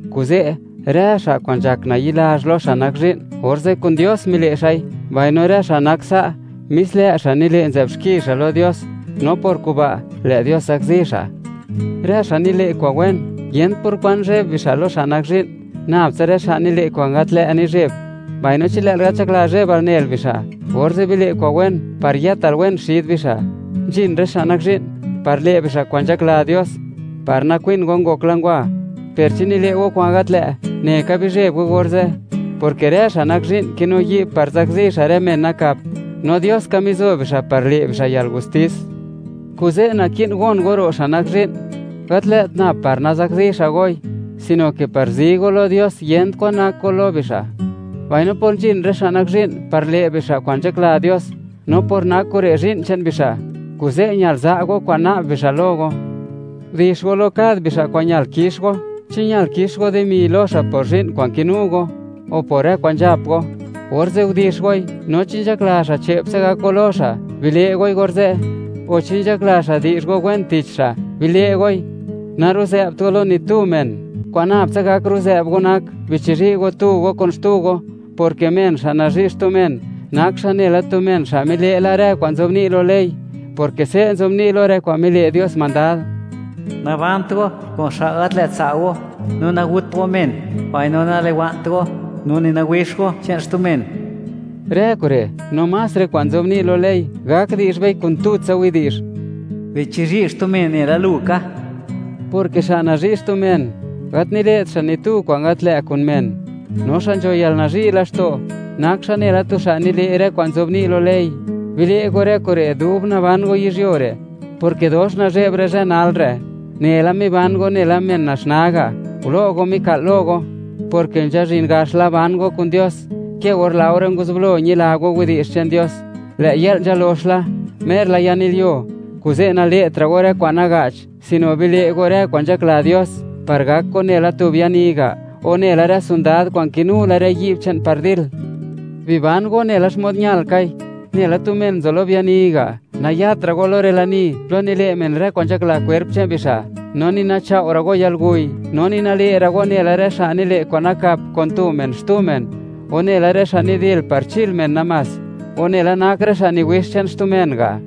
Kuze', rë xa' kwa'n nzhak nayi'lazh lo xa' nak zhi'n, orze' kun Dios mile' xa'i, mbaino rë xa' nak sa', mis lë' xa' nile' nzë'b xki xa' lo Dios, no por kuba' lë' Dios zakzi xa'. Rë xa' nile' kwa'n wen, yent por kwan zheb xa' lo xa' nak zhi'n, nab tsa rë xa' nile' kwa'n gat lë' nizheb. Mbaino chi lë'l gat nzhakla zhebal nel bixa', orze' bile' kwa'n wen par yëtal wen xid bixa'. Nzhin rë xa' nak zhi'n par le' bixa' kwa'n nzhakla Dios par nakwin go ngokla ngwa. Per chi nile' go kwa'n gat lë', neka bizheb go orze', porke rë xa' nak zhi'n kinu yi'b par zakzi xa' rë men nakap, no Dios ka mizo bixa' par le' bixa' yalgustis. Kuze' naki'n gon go ro' xa' nak zhi'n, gat lë't nab par nazakzi xa' goi, sino ke par zi go lo Dios, yent kwan nak go lo bixa'. Mbaino por nzhin rë xa' nak zhi'n par le' bixa' kwa'n nzhakla Dios, no por nak kure' zhi'n che'n bixa', kuze' ñal za' go kwa'n na'b bixa' lo go. Gudix go lo kad bixa' kwa'n ñal kix go. Chi ñal kix go dimi lo xa' por zhi'n kwa'n kinu go o por rë kwa'n nzhap go, orze' gudix goi; no chi nzhakla xa' che'ptsa gak go lo xa', bile' goi orze'; o chi nzhakla xa' di'zh go wen tich xa', bile' goi. Naruzë'bt go lo ni tu men; kwa'n nab tsa gak ruzë'b go nak, bichizhi' go tu go kun xtu go, porke men xa' nazhi' xtu men, nak xa' nela tu men xa' mile' la rë kwa'n nzobni' lo ley, porke se' nzobni' lo rë kwa'n mile' Dios mandad: “Nabant go kun xa' gat lë't tsa' go, no nagut go men, mbaino naliwa'nt go, no ni nawixt go gap go kwa'n kinu xtu men.” Rë kure' no más rë kwa'n nzobni' lo ley gak di'zh bei kun tutsa widi'zh: “Bichizhi' xtu men nela lu ka”, porke xa' nazhi' xtu men, gat nile't xa' ni tu kwa'n gat lë' kun men; no xa' nzho yalnazhi' laxto', nak xa' nela tu xa' nile' rë kwa'n nzobni' lo ley. Bile' go rë kure' dub naban go yizhyuo re', porke dox nazhe'b rë zhë nalre'; une la miban go nela men naxnaa ga'; gulo' go mika'l lo go, porke nzhazhin gax la ban go kun Dios ke or laore nguzublo ñila go widi'zh che'n Dios. Lë' yë'l nzalox la, mer la yanilyuo, kuze' nale'tra' go rë kwa'n naga'ch, sino bile' go rë kwa'n nzhakla Dios par gak go nela tu biani ga', o nela rë sondad kwa'n kinu la rë yi'b che'n par dil. Biban go nela xmod ñal kai, nela tu men nzo lo biani ga'; nayatra' go lo rë lani plo nile' men rë kwa'n nzhakla kwerp che'n bixa', no ni nachao' ra' go yalguy, no ni nale' ra' go nela rë xa' nile' kwa'n nakap kun tu men xtu men, o nela rë xa' nidil par chil men namás, o nela nak rë xa' niwix che'n xtu men ga'.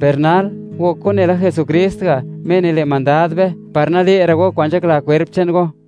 Per nal, gok go nela Jesukrist ga', Me nile' mandad be, par nale'ra' go kwa'n nzhakla kwerp che'n go.